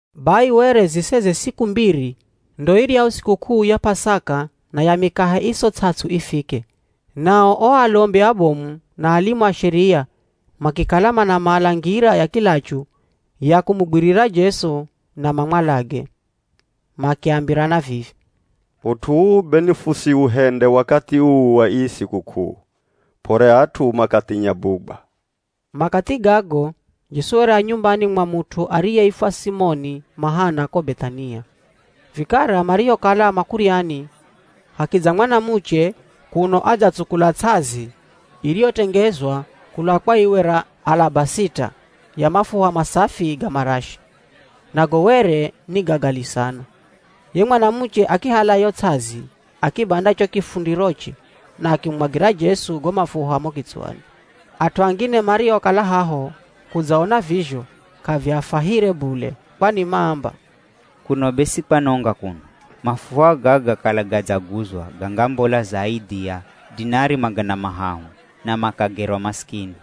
Bai were zisere siku mbiri ndo iryahu sikuk'uu ya P'asaka na ya Mikahe Iso Ts'ats'u ifike, nao o alombi abomu na alimu a Sheria makikala manamala ngira ya kilachu ya kumugwirira Jesu na mamwalage. Makiambirana vivi, “Ut'u uu be nifusiuhende wakathi uu wa ii sikuk'uu, p'ore at'u makathinya bugwa.” Makathi gago Jesu were a nyumbani mwa mut'u ariyeifwa Simoni Mahana ko Beth'ania. Vikara marihokala makuryani hakidza mwanamuche kuno adzatsukula ts'azi iriyotengezwa kula kwa iwe ra alabasita ya mafuha masafi ga marashi, nago were ni ga gali sana. Ye mwanamuche akihala yo ts'azi akibanda cho kifundiroche na akimumwagira Jesu go mafuha mo kitswani. At'u angine mariokala haho kudzaona vizho, k'aviafwahire bule kwani maamba, “Kuno be si kwanonga kuno? Mafuha gaga kala gadzaguzwa gangambola zaidhi ya dinari magana mahahu na makagerwa masikini.”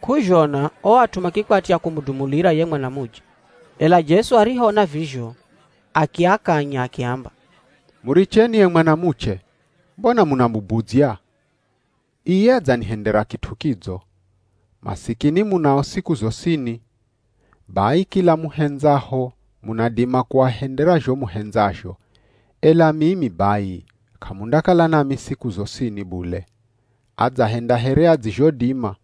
K'uzhona o at'u makikwatya kumudumulira ye mwanamuche. Ela Jesu arihoona vizho akiakanya akiamba, “Muricheni ye mwanamuche, mbona munamubudzya? Iye adzanihendera kit'u kidzo. Masikini munao siku zosini. Bai kila muhendzaho munadima kuahendera zho muhendzazho, ela mimi bai k'amundakala nami siku zosini bule. Adzahenda here adzizhodima,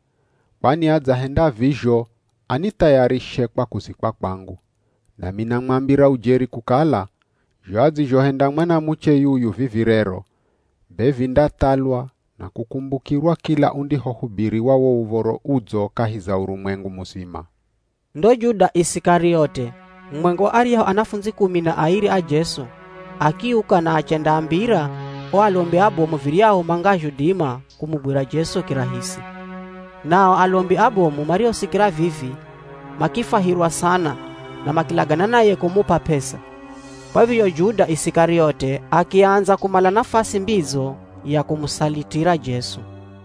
kwani adzahenda vizho anithayarishe kwa kuzikwa kwangu. Nami namwambira ujeri kukala, zho adzizhohenda mwanamuche yuyu vivi rero, be vindathalwa na kukumbukirwa kila undihohubiriwa wo Uv̱oro Udzo kahi za urumwengu muzima.” Ndo Juda Isikariote, mumwenga wa aryahu anafundzi kumi na airi a Jesu akiuka na achendaambira o alombi abomu viryahu mangazhodima kumugwira Jesu kirahisi. Na o alombi abomu marihosikira vivi makifwahirwa sana na makilagana naye kumup'a p'esa. Kwa vizho Juda Isikariote akiandza kumala nafasi mbidzo ya kumusalitira Jesu.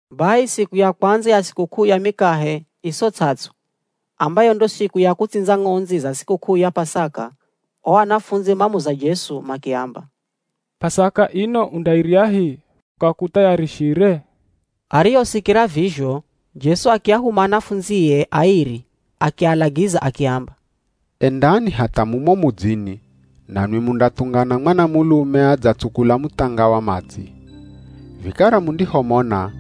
Bai siku ya kwandza ya sikuk'uu ya Mikahe Iso Ts'ats'u, ambayo ndo siku ya kutsindza ng'ondzi za sikuk'uu ya P'asaka, o anafundzi mamuza Jesu makiamba, “P'asaka ino undairyahi, fukakuthayarishire?” Arihosikira vizho Jesu akiahuma anafundzie airi akialagiza akiamba, “Endani hatha mumo mudzini nanwi mundathungana mwanamulume adzatsukula muthanga wa madzi. Vikara mundihomona,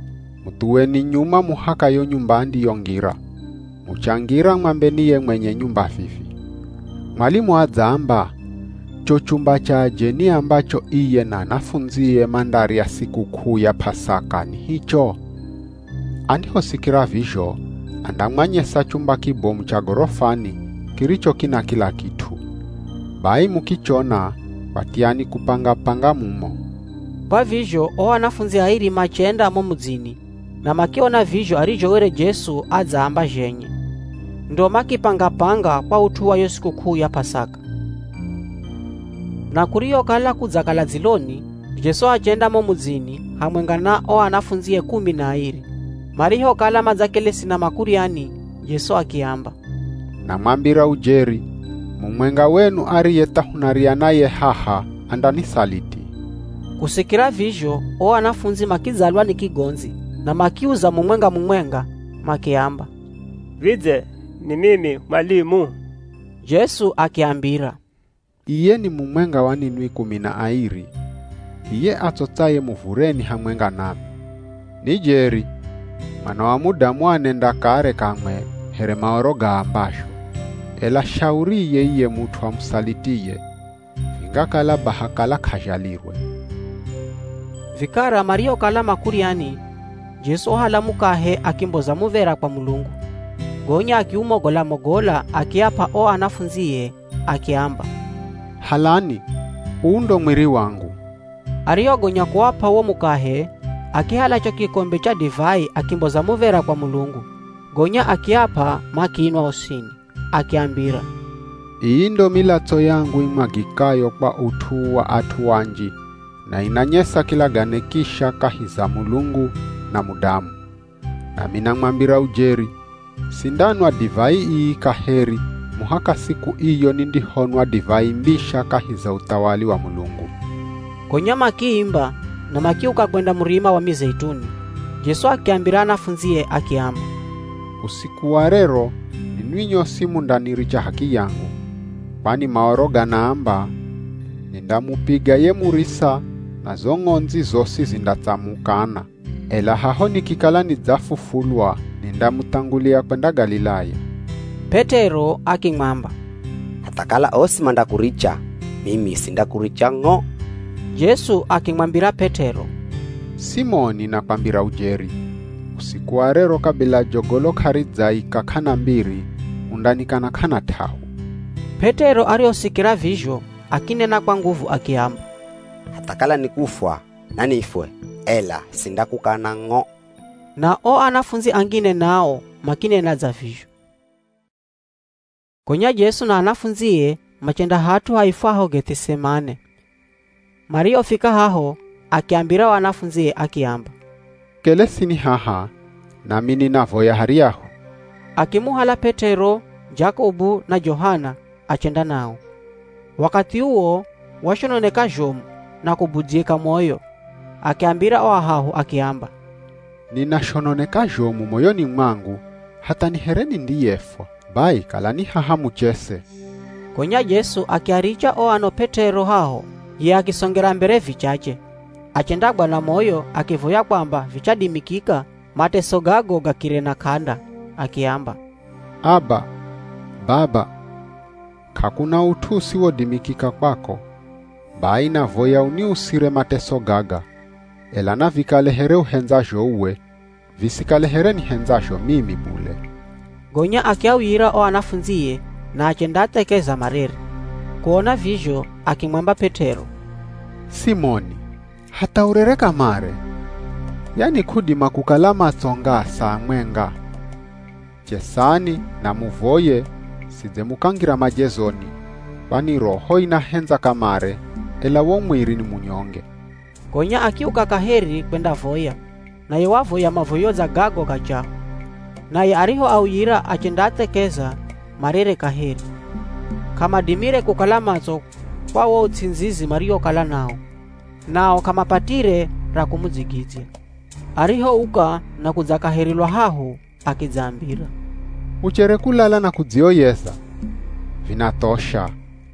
muthuweni nyuma muhaka yo nyumba andiyongira. Muchangira mwambeni ye mwenye nyumba vivi, ‘Mwalimu adzaamba, cho chumba cha ajeni ambacho iye na anafundzie mandarya sikuk'uu ya P'asaka ni hicho?’ Andihosikira vizho andamwanyesa chumba kibomu cha gorofani kiricho kina kila kit'u. Bai mukichona kwatyani kupanga-panga mumo.” Kwa vizho o anafundzi airi machenda mo mudzini na makiona vizho arizho were Jesu adzaamba zhenye. Ndo makipanga-panga kwa ut'u wa yo sikuk'uu ya P'asaka. Na kurihokala kudzakala dziloni, Jesu achenda mo mudzini hamwenga na o anafundzie kumi na airi. Marihokala madzakelesi na makuryani, Jesu akiamba, “Namwambira ujeri, mumwenga wenu ariye tha hunarya naye haha, andanisaliti.” Kusikira vizho o anafundzi makidzalwa ni kigondzi na makiuza mumwenga-mumwenga makiamba, “Vidze, ni mimi mwalimu?” Jesu akiambira, “Iye ni mumwenga wa ninwi kumi na airi, iye atsotsaye muvureni hamwenga nami. Ni jeri Mwana wa Mudamu anenda kare kamwe here Maoro gaambazho, ela shauriye iye mut'u amusalitiye! Vingakala baha kala k'azhalirwe.” Vikara marihokala makuryani, Jesu wahala mukahe akimboza muv̱era kwa Mulungu, gonya akiumogola-mogola akiap'a o anafundzie, akiamba, “Halani, uu ndo mwiri wangu.” Arihogonya kuap'a wo mukahe, akihala cho kikombe cha divai akimboza muv̱era kwa Mulungu, gonya akiap'a makinwa osini. Akiambira, “Ii ndo milatso yangu imwagikayo kwa ut'u wa at'u anji na inanyesa kilagane kisha kahi za Mulungu na mudamu. Nami namwambira ujeri, sindanwa divai ii kaheri muhaka siku iyo nindihonwa divai mbisha kahi za uthawali wa Mulungu.” Gonya makiimba na makiuka kwenda Murima wa Mizeituni. Jesu akiambira anafundzie akiamba, “Usiku wa rero ninwi nyosi mundaniricha h'akiyangu. Kwani Maoro ganaamba, ‘Nindamupiga ye murisa na zo ng'ondzi zosi zindatsamukana.’ Ela haho nikikala nidzafufulwa, nindamuthangulia kwenda Galilaya.” P'et'ero akimwamba, “Hatha kala osi mandakuricha, mimi sindakuricha ng'o!” Jesu akimwambira P'et'ero, “Simoni nakwambira ujeri, usiku wa rero kabila jogolo k'aridzaika k'ana mbiri, undanikana k'ana t'ahu.” P'et'ero arihosikira vizho akinena kwa nguvu akiamba, “Hatha kala ni kufwa nanifwe, ela sindakukana ng'o!” Na o anafundzi angine nao makinena dza vizho. Gonya Jesu na anafundzie machenda hat'u haifwaho Geth'isemane. Marihofika haho, akiambira o anafundzie akiamba, “Kelesini haha nami ninavoya haryahu.” Akimuhala P'et'ero, Jakobu na Johana achenda nao. Wakathi uwo washononeka zhomu na kubudzyika moyo. Akiambira o ahahu akiamba, “Ninashononeka zhomu moyoni mwangu hatha ni here nindiyefwa. Bai kalani haha muchese.” Gonya Jesu akiaricha o ano P'et'ero haho, ye akisongera mbere vichache. Achendagwa na moyo akivoya kwamba vichadimikika mateso gago gakire na k'anda. Akiamba, “Aba! Baba! K'akuna ut'u usiwodimikika kwako. Bai navoya uniusire mateso gaga, ela navikale here uhendzazho uwe, visikale here nihendzazho mimi bule.” Gonya akiauyira o anafundzie na achendaathekeza marere. Kuona vizho akimwamba P'et'ero, “Simoni hatha urere kamare! Yani k'udima kukala matso ngaa saa mwenga? Chesani na muvoye sidze mukangira majezoni, kwani roho inahendza kamare, ela wo mwiri ni munyonge.” Gonya akiuka kaheri kwendavoya, naye wavoya mavoyo dza gago ga chaho. Naye arihoauyira achendaathekeza marere kaheri. K'amadimire kukala matso kwa wo uts'indzizi mariwokala nawo. Nao k'amapatire ra kumudzigidzya. Arihouka na kudza kaheri lwa hahu akidzaambira, “Muchere kulala na kudzioyeza? Vinathosha.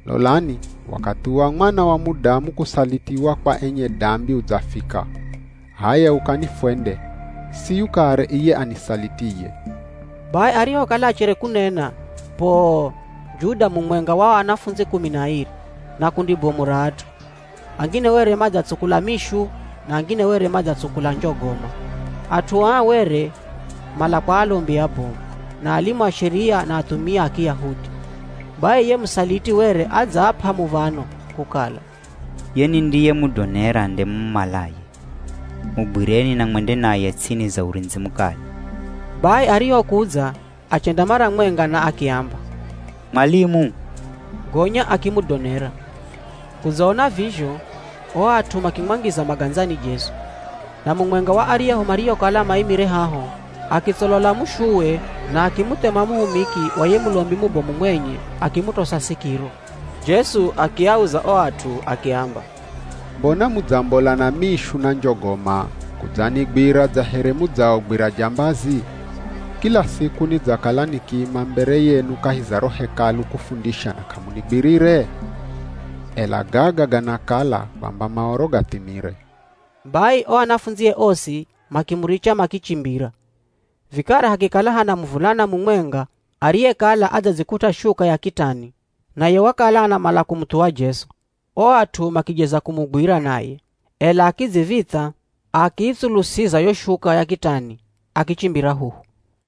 Lolani wakathi wa Mwana wa Mudamu kusalitiwa kwa enye dambi udzafika. H'aya ukani fwende. Siyu kare iye anisalitiye!” Bai arihokala achere kunena, poo, Juda mumwenga wa o anafundzi kumi na airi na kundi bomu ra at'u. Angine were madzatsukula mishu na angine were madzatsukula njogoma. At'u aa were mala kwa alombi abomu, na alimu a Sheria na athumia a Kiyahudi. Bai ye musaliti were adzaap'a muv̱ano kukala, “Ye nindiyemudonera nde mumumalaye, mugwireni na mwende naye ts'ini za urindzi mukali.” Bai arihokudza achenda mara mwenga na akiamba, “Mwalimu,” gonya akimudonera. Kudzaona vizho o at'u makimwangiza magandzani Jesu. Na mumwenga wa aryahu mariokala maimire haho, akitsolola mushuwe na akimuthema muhumiki wa ye Mulombi mubomu mwenye akimutosa sikiro. Jesu akiauza o at'u akiamba, “Mbona mudzambola na mishu na njogoma kudzanigwira dza here mudzaogwira jambazi? Kila siku nidzakala nikiima mbere yenu kahi za ro Hekalu kufundisha na k'amunigwirire? Ela gaga ganakala kwamba Maoro gathimire.” Bai o anafundzie osi makimuricha makichimbira. Vikara hakikala hana muvulana mumwenga ariyekala adzadzikut'a shuka ya kitani naye wakala anamala kumuthuwa Jesu, o at'u makijeza kumugwira naye, ela akidziv̱itha, akiitsulusiza yo shuka ya kitani akichimbira huhu.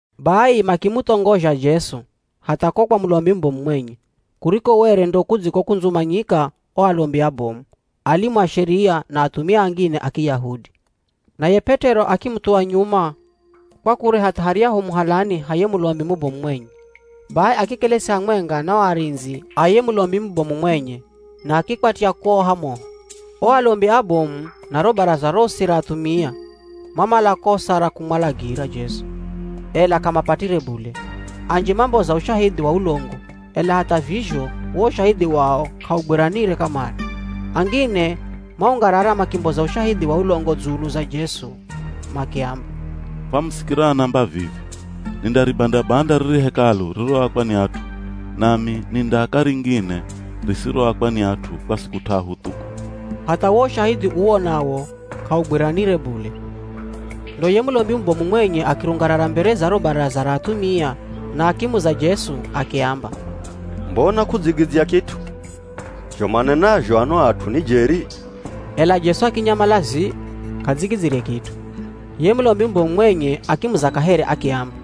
Bai makimuthongozha Jesu hatha ko kwa Mulombi mubomu mwenye, kuriko were ndo kudzikokundzumanyika o alombi abomu, alimu a Sheria, na athumia angine a Kiyahudi. Naye P'et'ero akimuthuwa nyuma kwa kure hatha haryahu muhalani ha ye Mulombi mubomu mwenye, bai akikelesi hamwenga na o arindzi a ye Mulombi mubomu mwenye na akikwatya kuoha moho. O alombi abomu na ro Baraza rosi ra athumia, mamala kosa ra kumwalagira Jesu, ela k'amapatire bule. Anji mamboza ushahidhi wa ulongo, ela hatha vizho wo ushahidhi wao k'augwiranire kamare. Angine maungarara makimboza ushahidhi wa ulongo dzulu za Jesu makiamba, “Famusikira anaamba vivi, ‘Nindaribanda-banda riri Hekalu ririroakwa ni at'u, nami nindaaka ringine risiroakwa ni at'u kwa siku t'ahu thu.’” Hatha wo ushahidhi uwo nawo k'augwiranire bule. Ndo ye Mulombi mubomu mwenye akirungarara mbere za ro Baraza ra athumia na akimuza Jesu akiamba, “Mbona k'udzigidzya kit'u. Zho manenazho ano at'u ni jeri?” Ela Jesu akinyamala zii, k'adzigidzyire kit'u. Ye Mulombi mubomu mwenye akimuza kaheri, akiamba,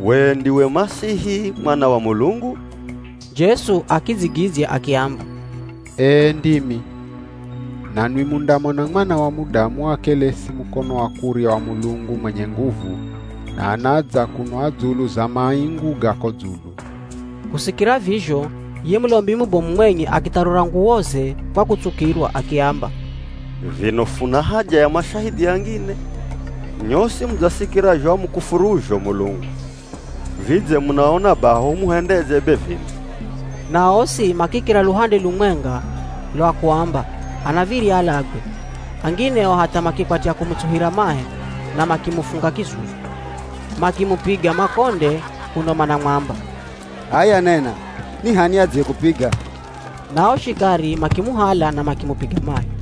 “We ndiwe ye Masihi Mwana wa Mulungu?” Jesu akidzigidzya akiamba, “Ee ndimi. Nanwi mundamona Mwana wa Mudamu akelesi mukono wa kurya wa Mulungu mwenye nguvu, na anadza kuno a dzulu za maingu ga ko dzulu.” Kusikira vizho ye Mulombi mubomu mwenye akitharura nguwoze kwa kutsukirwa, akiamba, “Vino funa haja ya mashahidhi angine? Nyosi mudzasikira zho amukufuruzho Mulungu. Vidze munaona baha humuhendedze be vino?” Na osi makikira luhande lumwenga lwa kuamba anav̱irya alagwe. Angine o hatha makikwatya kumutsuhira mahe na makimufunga kizuzu, makimupiga makonde kuno manamwamba, “H'aya nena ni h'ani ye adziyekupiga?” Na o shikari makimuhala na makimupiga mahi.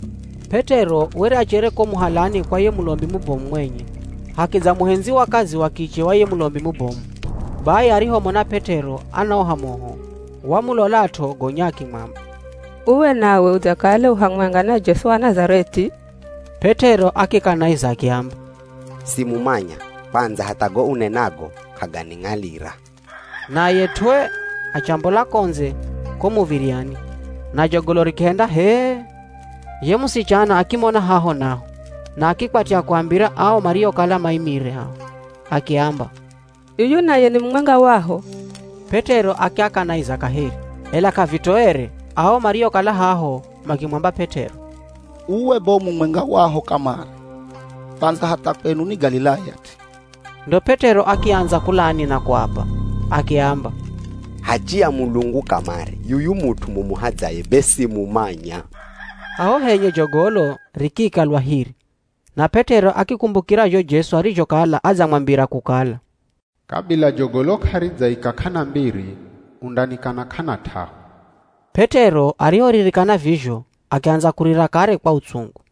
P'et'ero were achere ko muhalani kwa ye Mulombi mubomu mwenye, hakidza muhendzi wa kazi wa kiche wa ye Mulombi mubomu. Bai arihomona P'et'ero anaoha moho, wamulolat'o gonya akimwamba, “Uwe nawe udzakala u hamwenga na Jesu wa Nazareth'i?” P'et'ero akikanaiza akiamba, “Simumanya, kwandza hatha go unenago k'aganing'alira.” Naye tw'ee achambola ko ndze ko muv̱iryani, na jogolo rikihenda hee. Ye musichana akimona haho naho na akikwatya kuambira ao mariokala maimire haho, akiamba, “Yuyu naye ni mumwenga waho.” P'et'ero akiakanaiza kaheri, ela k'avitoere ao mariokala haho makimwamba P'et'ero, “Uwe be u mumwenga waho kamare, kwandza hatha kwenu ni Galilaya t'i.” Ndo P'et'ero akiandza kulani na kuapa, akiamba, “Hachi ya Mulungu kamare yuyu mut'u mumuhadzaye be simumanya.” Haho henye jogolo rikiika lwa hiri na P'et'ero akikumbukira zho Jesu arizhokala adzamwambira kukala, “Kabila jogolo k'aridzaika k'ana mbiri, undanikana k'ana t'ahu.” P'et'ero arihoririkana vizho akiandza kurira kare kwa utsungu.